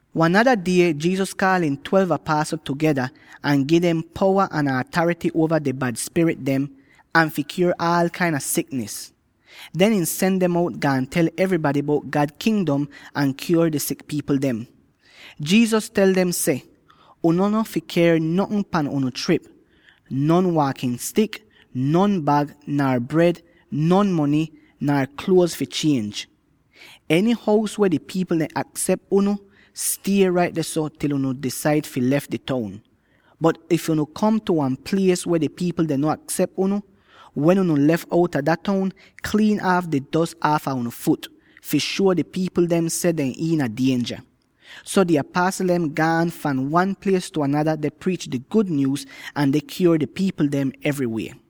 Wan nada die Jesus kaal ihn twelve apasl tugeda, ahn ihn gi dem powa ahn atarity uova di bad spirit dem, ahn fi kyuor aal kain a siknis. Den ihn sen dem out, gaan tel evrybady bout God Kingdom ahn kyuor di sik pipl dem. Jesus tel dem seh, “Unu no fi ker notn pan unu trip: non waakin stik, non bag, nar bred, non mony, nar kluoz fi chienj.” Eny hous weh di pipl dem aksep unu, stie rait dehso til unu disaid fi lef di toun. Bot if unu kom tu wan plies weh di pipl dem no aksep unu, wen unu lef outa dah toun, kliin aaf di dos aafa unu fut, fi shuo di pipl dem seh dehn iina dienja. So di apasl dehn gaan fahn wan plies tu anada deh priich di gud nyuuz, ahn deh kyuor di pipl dem evry weh.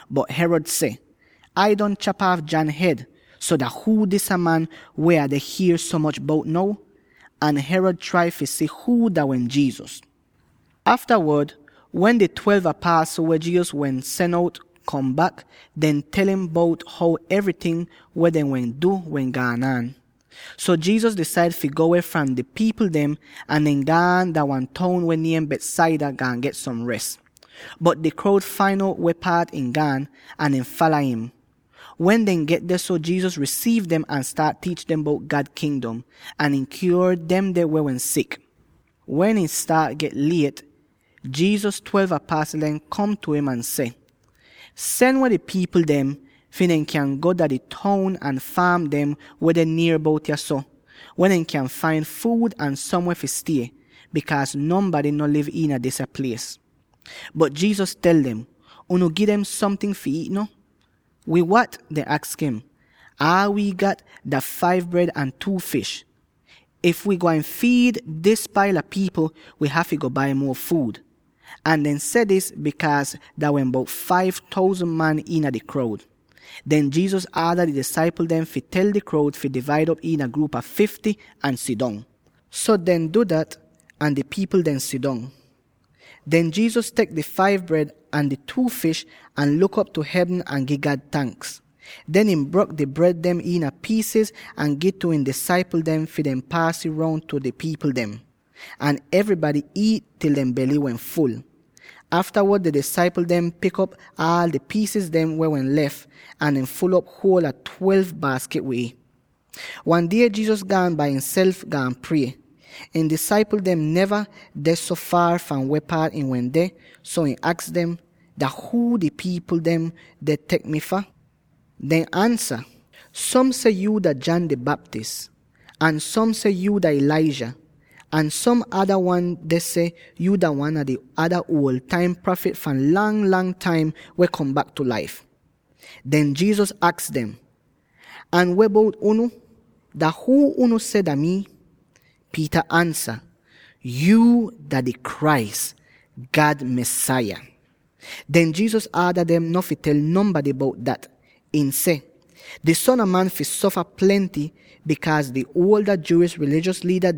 Bot Herod seh, “Ai don chap aaf John hed; so dah huu disa man weh Ah deh hier so moch bout now?” Ahn Herod trai fi si huu dah wehn Jesus. Aftawod, wen di twelve apasl, weh Jesus wehn sen out kom bak, dehn tel im bout how evryting weh dehn wehn du wehn gaan aan. So Jesus disaid fi go weh fram di pipl dem, ahn dehn gaan dah wan toun weh niem Bethsaida, gaan get som res. Bot di kroud fain out weh paat ihn gaan, ahn dehn fala im. Wen dehn get dehso, Jesus risiiv dem ahn staat tiich dem bout God Kingdom, ahn ihn kyuor demde weh wehn sik. Wen ih staat get liet, Jesus twelve apasl dem kom tu im ahn seh, “Sen weh di pipl dem, fi dehn kyan go dah di toun ahn faam dem weh deh nier bout yahso, weh dehn kyan fain fuud ahn somweh fi stie; bikaaz nonbady no liv iina disa plies.” Bot Jesus tel dem, “Unu gi dem somting fi iit no.” “Wid wat?” dehn aks im, “Aal wi gat dah five bred ahn two fish! If wi gwain fiid dis paila pipl, wi hafy go bai muo fuud.” Ahn dehn wehn seh dis, bikaaz dah wehn bout five thousand man iina di kroud. Den Jesus aada ihn disaipl dem fi tel di kroud fi divaid op iina gruup a fifty ahn sidong. So dehn du dat, ahn di pipl dehn sidong. Den Jesus tek di five bred ahn di two fish ahn luk op tu hevn ahn gi God tanks. Den ihn brok di bred dem iina piisiz ahn gi'ih tu ihn disaipl dem fi dehn paas ih roun tu di pipl dem. Ahn evrybady iit til dehn bely wehn ful. Aftawod di disaipl dem pik op aal di piis dem weh wehn lef, ahn dehn ful'op huol a twelve baaskit wid ih. Wan die Jesus gaan bai imself, gaan prie. Ihn disaipl dehn neva deh so faar fahn weh paat ihn wende, so ihn aks dem, “Dah huu di pipl dem deh tek mii fah?” Dehn ansa, “Som seh yu dah John di Baptist, ahn som seh yu dah Elijah, ahn som ada wan deh seh yu dah wan a di ada uol taim prafit fahn lang-lang taim weh kom bak tu laif.” Den Jesus aks dem, “Ahn weh bout unu? Dah huu unu seh dah mii?” Peter ansa, “Yuu dah di Christ, God Mesaya!” Den Jesus aada dem no fi tel nonbady bout dat. Ihn seh, “Di Son a Man fi sofa plenty, bikaaz di Jewish rilijos liida,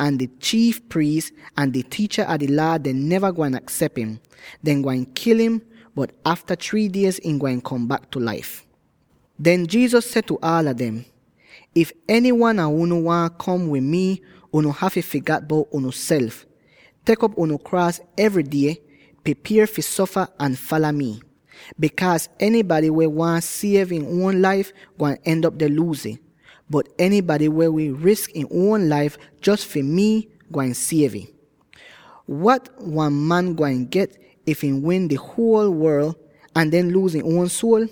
ahn di chiif priis, ahn di tiicha a di Laa dem neva gwain aksep im. Dehn gwain kil im, bot afta three diez, ihn gwain kom bak tu laif.” Den Jesus seh tu aala dem: “If enywan a unu waahn kom wid mii, unu hafy figat bout unuself, tek op unu kraas evry die —pripier fi sofa— ahn fala mi. Bikaaz enybady weh waahn siev ihn uon laif, gwain end'op deh luuz ih, bot enybady weh wi risk ihn uon laif jos fi mii, gwain siev ih. Wat wan man gwain get if ihn win di huol worl, ahn den luuz ihn uon suol?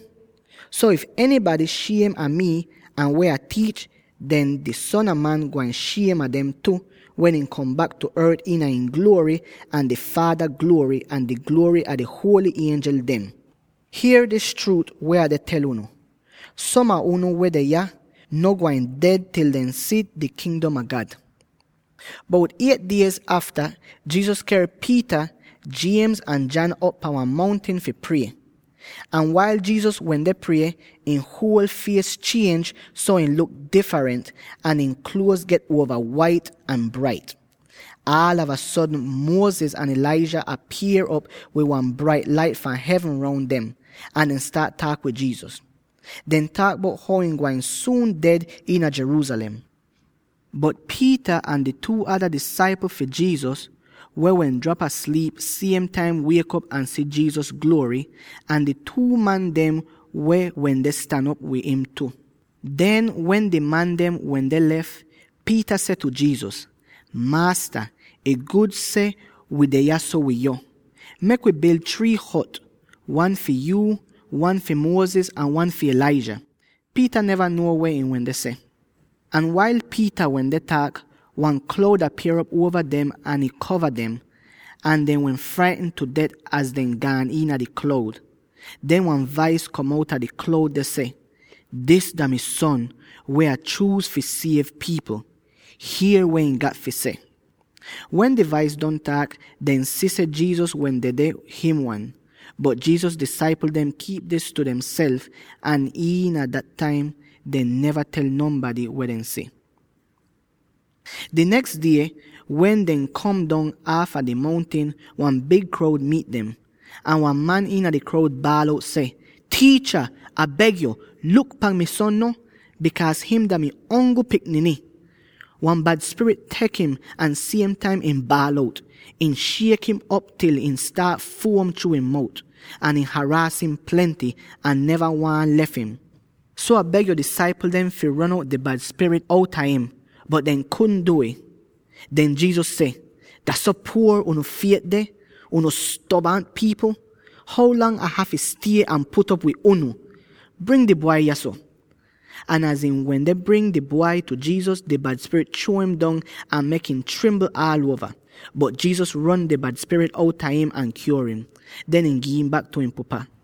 So, if enybady shiem a mii ahn weh Ah tiich, den di Son a Man gwain shiem a dem tu, wen ihn kom bak tu ort iina ihn gluory, ahn di Faada gluory ahn di gluory a di huoly ienjel dem. Hier dis chruut weh Ah deh tel unu: Som a unu weh deh yah, no gwain ded til dehn si God Kingdom.” Bout eight diez afta, Jesus ker Peter, James ahn John op pahn wan mountin fi prie. Ahn wail Jesus wende prie, ihn huol fies chienj so ihn luk difrent, ahn ihn kluoz get uova wait ahn brait. Aalava sodn Moses ahn Elijah apier'op wid wan brait lait fahn hevn roun dem, ahn dehn staat taak wid Jesus! Dehn taak bout how ihn gwain suun ded iina Jerusalem. Bot Peter ahn di two ada disaipl fi Jesus —weh wehn drap asliip— siem taim wiek'op ahn si Jesus gluory, ahn di two man dem weh wende stan op wid im tu! Den wen di man dem wende lef, Peter seh tu Jesus, “Maasta, ih gud seh wi deh yahso wid yo! Mek wi bil three hot —wan fi yuu, wan fi Moses ahn wan fi Elijah!” Peter neva nuo weh ihn wende seh. Ahn wail Peter wende taak, wan kloud apier'op uova dem ahn ih kova dem, ahn dehn wehn fraitn tu det az dehn gaan iina di kloud. Den wan vais kom outa di kloud ahn seh, “Dis dah mi Son, weh Ah chuuz fi siev pipl. Hier weh ihn gat fi seh.” Wen di vais don taak, dehn si seh Jesus wehn dedeh him wan. Bot Jesus disaipl dehn kiip dis tu demself, ahn iina dah taim dehn neva tel nonbady weh dehn si. Di neks die, wen dehn kom dong aafa di mountin, wan big kroud miit dem. Ahn wan man iina di kroud baal out seh, “Tiicha, Ah beg yo, luk pan mi son no —bikaaz him dah mi ongl pikniny! Wan bad spirit tek im ahn siem taim ihn baal out; ih shiek im op til ihn staat fuom chruu ihn mout; ahn ih haraas im plenty, ahn neva waahn lef im! So, Ah beg yo disaipl dem fi ron out di bad spirit outa im, bot dehn kudn du'ih.” Den Jesus seh, “Dah so puor unu fiet deh, unu stobant pipl! How lang Ah hafy stie ahn put'op wid unu? Bring di bwai yahso!” Ahn az ihn wende bring di bwai tu Jesus, di bad spirit chruo im dong ahn mek im trimbl aal uova. Bot Jesus ron di bad spirit outa im ahn kyuor im; den ihn gi'im bak tu ihn pupa.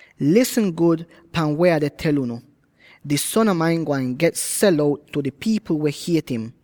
“Lisn gud pan weh Ah deh tel unu: di Son a Man gwain get sel out tu di pipl weh hiet im.”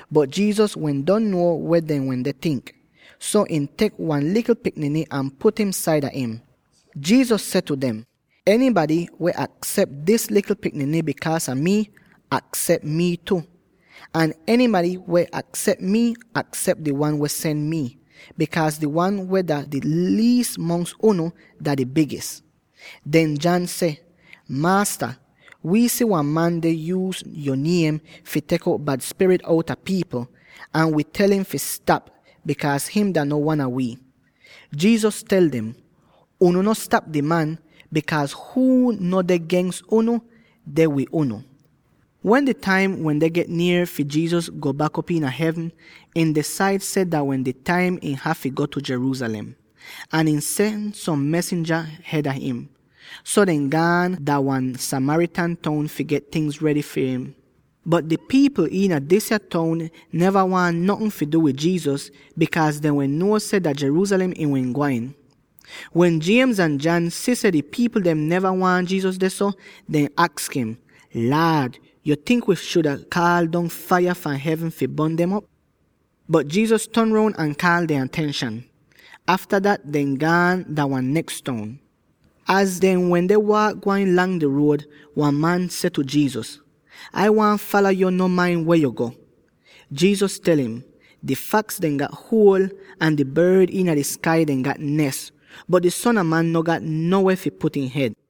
Bot Jesus wehn don nuo weh dehn wende tink, so ihn tek wan likl pikniny ahn put im saida im. Jesus seh tu dem, “Enybady weh aksep dis likl pikniny bikaaz a mii, aksep mii tu; ahn enybady weh aksep mii, aksep di wan weh sen mii. Bikaaz di wan weh dah di liis mongs unu, dah di bigis.” Den John seh, “Maasta, wi si wan man deh yuuz yo niem fi tek out bad spirit outa pipl, ahn wi tel im fi stap, bikaaz him dah no wan a wi.” Jesus tel dem, “Unu no stap di man, bikaaz huu no deh gens unu, deh wid unu.” Wen di taim wende get nier fi Jesus get ker bak dah hevn, ihn disaid seh dah wehn di taim ihn hafy go Jerusalem, ahn ihn sen som mesinja hed a im. So dehn gaan dah wan Samaritan toun fi get tingz redy far im. Bot di pipl iina disya toun neva waahn notn fi du wid Jesus, bikaaz dehn wehn nuo seh dah Jerusalem ihn wehn gwain. Wen James ahn John si seh di pipl dem neva waahn Jesus dehso, dehn aks im, “Laad, yo tink wi shuda kaal dong faiya fahn hevn fi bon dem op?” Bot Jesus ton roun ahn kaal dehn atenshan. Afta dat dehn gaan dah wan neks toun. Az dehn wende waak gwain lang di ruod, wan man seh tu Jesus, “Ai waahn fala yo no main weh yo go.” Jesus tel im, “Di faks dem gat huol ahn di bord dem iina di skai gat nes, bot di Son a Man no gat no weh fi put ihn hed.”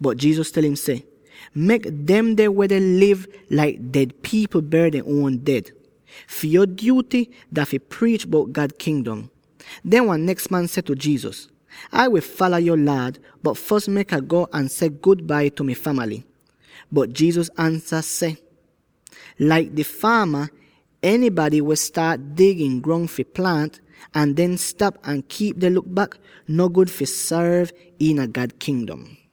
Bot Jesus tel im seh, “Mek demde weh deh liv laik ded pipl ber dehn uon ded. Fi yo dyuty dah fi priich bout God Kingdom.” Den wan neks man seh tu Jesus, “Ah wi fala yo Laad, bot fos mek Ah go ahn seh ‘gudbai’ tu mi famaly.” Bot Jesus ansa ahn seh, “Laik di faama, enybady weh staat dig ihn grong fi plaant, ahn den stap ahn kiip deh luk bak, no gud fi sorv iina God Kingdom.”